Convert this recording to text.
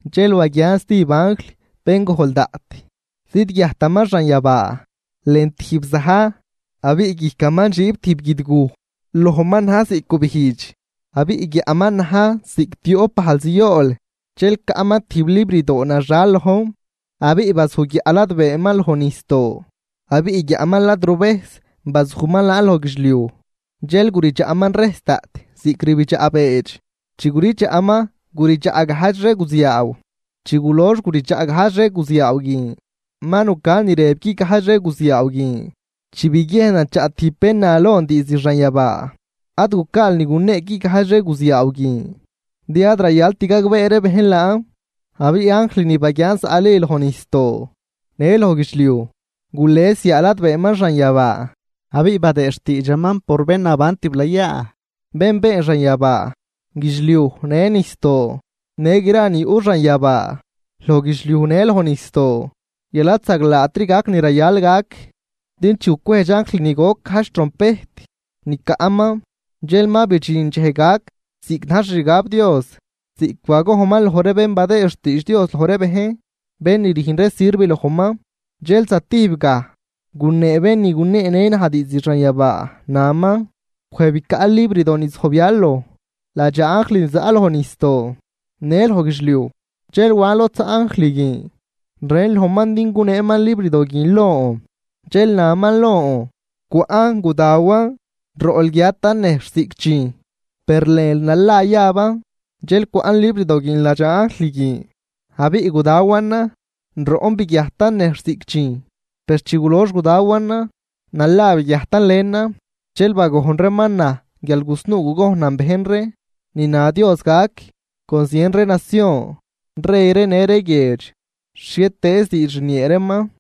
Dxel baguian stijb anjl bén gojl daꞌt, zidguiajtaman xanyabaa lën tijb za̱j abiꞌ guijcaman dxiib tijb guidguj. Lojman na̱j ziꞌc gubijdx, abiꞌ guiaꞌman na̱j ziꞌc tioꞌp bajl ziool. Dxel caꞌman tijb librdoo naxal lojn. Abiꞌ bazuj guiaꞌ ladbeeman loj nijsdoo, abiꞌ guiaꞌman lad ruvejs bazujman laan loj guidxliuj. Dxel guridxaꞌman rejs daꞌt ziꞌc rbidxaꞌ beedx, chi guridxaꞌman guridxaꞌ gajdx ree guziaaw. Chi gulox guridxaꞌ gajdx ree guziaaw guin, ma nucan ni rëb guigajdx ree guziaaw guin chi biguiejnan chaꞌ tijb bén na lon diizd xanyabaa: ―Ad gucaal ni gunee guigajdx ree guziaaw guin, din ad rayalt gagbee ree bejn laan. Abiꞌ anjl ni baguian zaꞌli loj nijsdoo në loj guidxliuj gules yaa ladbeeman xanyabaa, abiꞌ badëë xtiidxaman por bén naban tiblayaa, bén been xanyabaa, guidxliuj në nijsdoo, në gra ni yuꞌ xanyabaa, loj guidxliuj në loj nijsdoo guial ad zaglaatri gac ni rayal gac. Din chi gucwejdx anjl ni goc gajdx trompejt ni caꞌman dxel ma bidxin dxej gac ziꞌc na̱j xixgab Dios, ziꞌc bagojnman loj ree bén badëë xtiidx Dios loj ree bejn bén ni rüjn ree sirv lojman. Dxel zatijb gaj gunee bén ni guneenë naj diizd xanyabaa, naman: ―Wej bicaꞌ librdo ni zojbyal loj ladxaa anjl ni zaꞌ loj nijsdoo në loj guidxliuj. Dxel wan lod zaꞌ anjl guin, rën lojman din guneeman librdo guin lon, dxel naman lon: ―Cwaꞌn gudawan. Roꞌl guiatan nejxh ziꞌc dxijn, per lënl nala yaban. Dxel cwaꞌn librdo guin ladxaa anjl guin, abiꞌ gudawanan. Roꞌn biguiajtan nejxh ziꞌc dxijn, per chi gulox gudawanan nala biguiajtan lënan. Dxel bagojn reeman naj guial gusnuu gugojnan bejn ree ni na Dios gac con zien ree nacion, rey ree në ree guiedx, xhietëëz diidx rniee reeman.